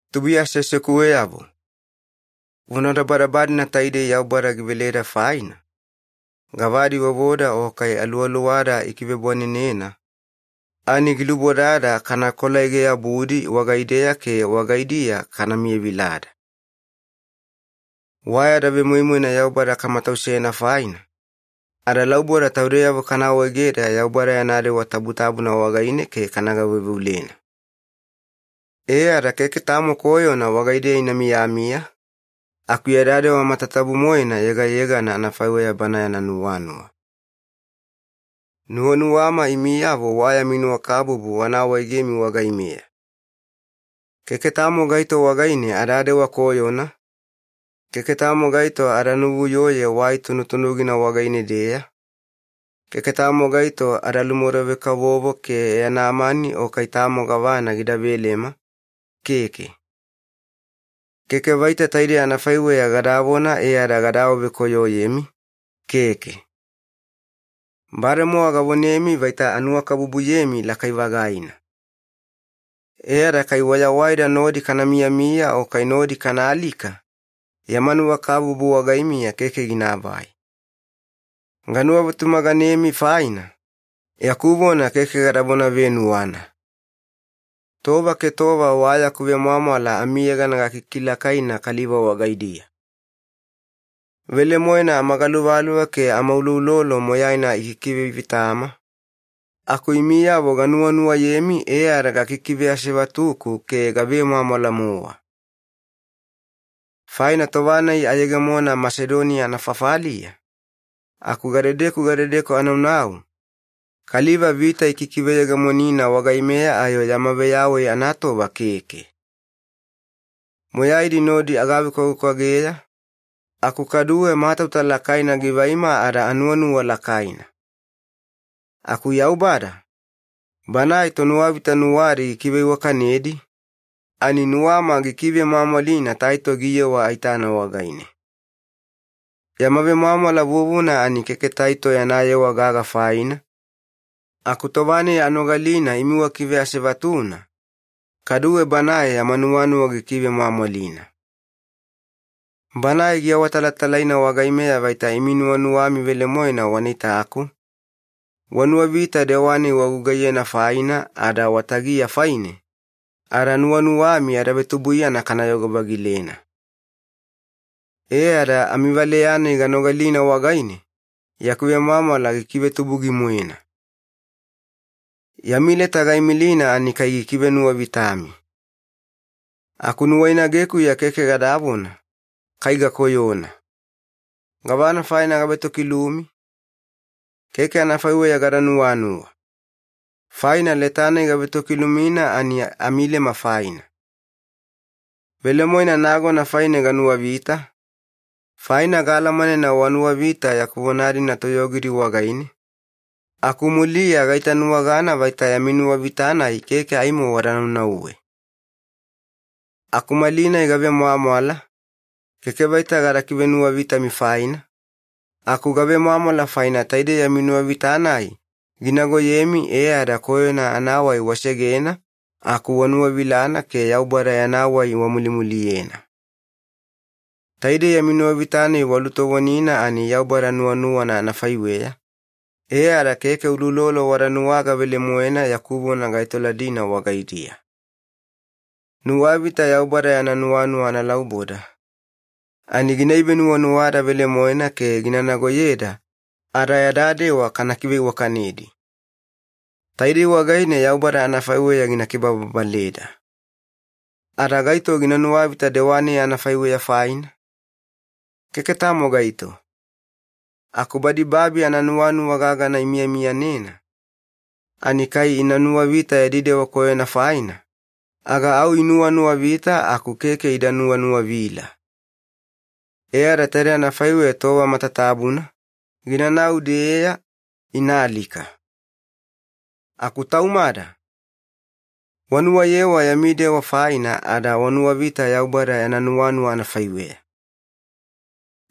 Tubuiya aseasekuweyavo, vonadabadaba-dina taidei Yaubada giveleda faina, gavadi vovoda o kai aluwaluwada ikivebwanenena, ani gilubodada kana kolaege-yabudi wagaideya ke wagaidiya kana miyavilada. Wa yada vemoimoina Yaubada kamatausena faina, adalauboda taudeyavo kana awaegeda Yaubada yana dewa tabutabuna wagaine ke kana gaveuveulena. E ada keke tamo koyona wagaideya ina miyamiya, aku yada dewa matatabu-moena yegayegana anafaiweya Bana yana nuwanuwa. Nuwanuwama imiyavo wa yami nuwakabubu wana awaegemi wagaimeya. Keke tamo gaito wagaine adadewa koyona, keke tamo gaito ada nuvuyoye wai tunutunugina wagaine-deya, keke tamo gaito ada lumodove-kavovo ke yana mani o kai tamo gavana gida velema, keke. Keke vaita taidei anafaiweya gadavona e ada gada awavekoyoyemi, keke. Bademowa gavonemi vaita anuwakabubuyemi lakai-vagaina. E ada kai wayawaida nodi kana miyamiya o kai nodi kana alika, yama nuwakabubu wagaimiya keke ginaavai. Ganuwavetumaganemi faina, yaku vona keke gadavona venuwana. Tova ke tova wa yaku vemwamwala amiyegana gakikilakaina kaliva wagaidiya. Velemoena amagaluvaluva ke amauloulolo moyaina ikikivevitama, aku imiyavo ganuwanuwayemi e ada gikikiveasevatuku ke gavemwamwala-mowa. Faina tova-nai ayegemona Masedoniya anafafaliya, aku gadedeku gadedeku anaunau, kaliva vita ikikiveyegemonina wagaimeya ayo yama veyawai anatova keke. Moyaidi nodi agavekwavekwageya, aku kaduwe matauta lakaina givaima ada anuwanuwa lakaina. Aku Yaubada, Banae tonuwavita nuwadi gikiveiwakanedi, ani nuwama gikivemwamwalina Taito giyewa aitana wagaine. Yama vemwamwala vuvuna ani keke Taito yana yewa gaga faina, aku tova-nai anogalina imi wakiveasevatuna, kaduwe banae yama nuwanuwa gikivemwamwalina. Banae giawatalatalaina wagaimeya vaita imi nuwanuwami velemoena wana itaku, wanuwavita dewa-nai wagugaiyena faina ada watagiya faine, ada nuwanuwami yada vetubuiyana kanayogo-vagilena. E ada amivaleya-nai ganogalina wagaine, yaku vemwamwala gikivetubugi-moena. Yami leta gaimilina ani kai gikivenuwavitami. Aku nuwainagekuya keke gadavona, “Kai gakoyona. Gavana faina gavetokilumi?” Keke anafaiweya gada nuwanuwa, faina leta-nai gavetokilumina ani amilema faina. Velemoena nagona faine ganuwavita, faina gaalamanena wanuwavita yaku vona-dina toyogidi wagaine, aku muliya gaitanuwagana vaita yami nuwavita-nai keke aimo wada naunauwe. Aku malinai gavemwamwala, keke vaita gada kivenuwavitami faina, aku gavemwamwala faina taidei yami nuwavita-nai ginagoyemi e ada koyona anawai wasegena aku wanuwavilana ke Yaubada yana wai wamulimuliyena. Taidei yami nuwavita-nai walutovonina ani Yaubada nuwanuwana anafaiweya, e ada keke uloulolo wada nuwaga velemoena yaku vona gaetoladina wagaidiya. Nuwavita Yaubada yana nuwanuwa analauboda, ani gina ivenuwanuwada velemoena ke gina nagoyeda ada yada dewa kana kiveiwakanedi. Taidei wagaine Yaubada anafaiweya gina kibababaleda. Ada gaito gina nuwavita dewa-nai anafaiweya faina? Keke tamo gaito. Aku badi babi ananuwanuwa gagana imiyamiyanena, ani kai ina nuwavita yadi dewa koyona faina, aga au inuwanuwavita aku keke ida nuwanuwavila. E ada taide anafaiweya tova matatabuna, ginanau-deya, ina alika. Aku taumada, wanuwayewa yami dewa faina ada wanuwavita Yaubada yana nuwanuwa anafaiweya.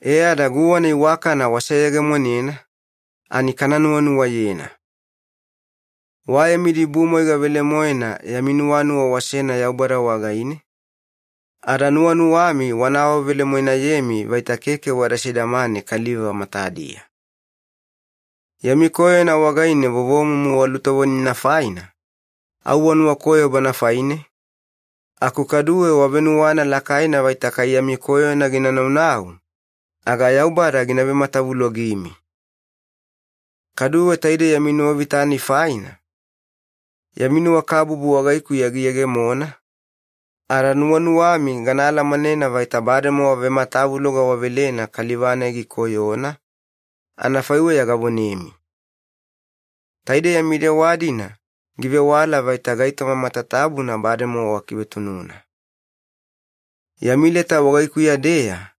E ada guwana iwakana waseyegemonena, ani kana nuwanuwayena. Wa yami dibumwaiga velemoena yami nuwanuwa wasena Yaubada wagaine, ada nuwanuwami wana awavelemoenayemi vaita keke wada sidamane kaliva matadiya. Yami koyona wagaine vovomumu walutovonina faina, au wanuwakoyo bana faine, aku kaduwe wavenuwana lakaina vaita kai yami koyona gina naunau, aga Yaubada gina vematavulogimi. Kaduwe taidei yami nuwavita-nai faina, yami nuwakabubu wagaikuya giyegemona, ada nuwanuwami gana alamanena vaita bademowa vematavuloga wavelena kaliva-nai gikoyona, anafaiweya gavonemi. Taidei yami dewa-dina givewala vaita gaitoma matatabuna bademowa wakivetununa. Yami leta wagaikuya-deya,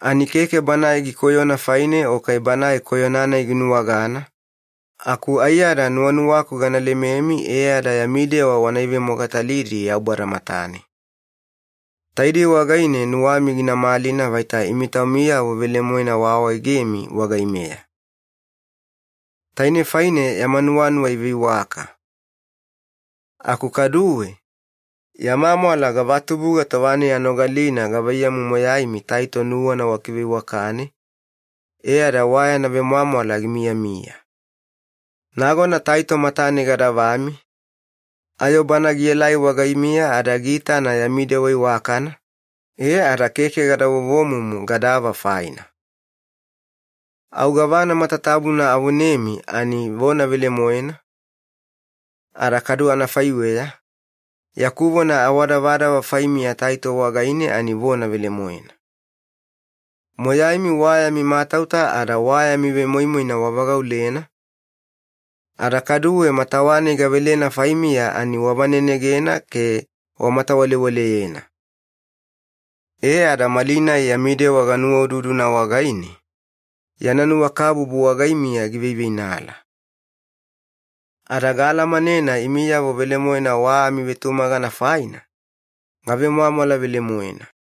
ani keke banae gikoyona faine o kai banae koyona-nai ginuwagana, aku aiyada nuwanuwaku gana lememi e ada yami dewa wana ivemogatalidi Yaubada matane. Taidei wagaine nuwami gina malina vaita imi taumiyavo velemoena waawaegemi wagaimeya. Tainei faine yama nuwanuwa iveiwaka. Aku kaduwe, yama mwala gavatubuga tova-nai anogalina gavaiyamu moyaimi Taito nuwana wakiveiwakane, e ada wa yana vemwamwala gimiyamiya. Nagona Taito matane gadavami, ayo bana gielai wagaimiya ada giitana yami dewa iwakana, e ada keke gada vovomumu gadava faina. Au gavana matatabuna avonemi ani vona velemoena, ada kadu anafaiweya, yaku vona awadavadava faimiya Taito wagaine ani vona velemoena. Moyaimi wa yami matauta ada wa yami vemoimoina wavagaulena, ada kaduwe matawa-nai gavelena faimiya ani wavanenegena ke wamatawalewaleyena. E ada malinai yami dewa ginuwaududuna wagaine, yana nuwakabubu wagaimiya giveiveinala. Ada gaalamanena imiyavo velemoena wa amivetumagana faina, gavemwamwala velemoena.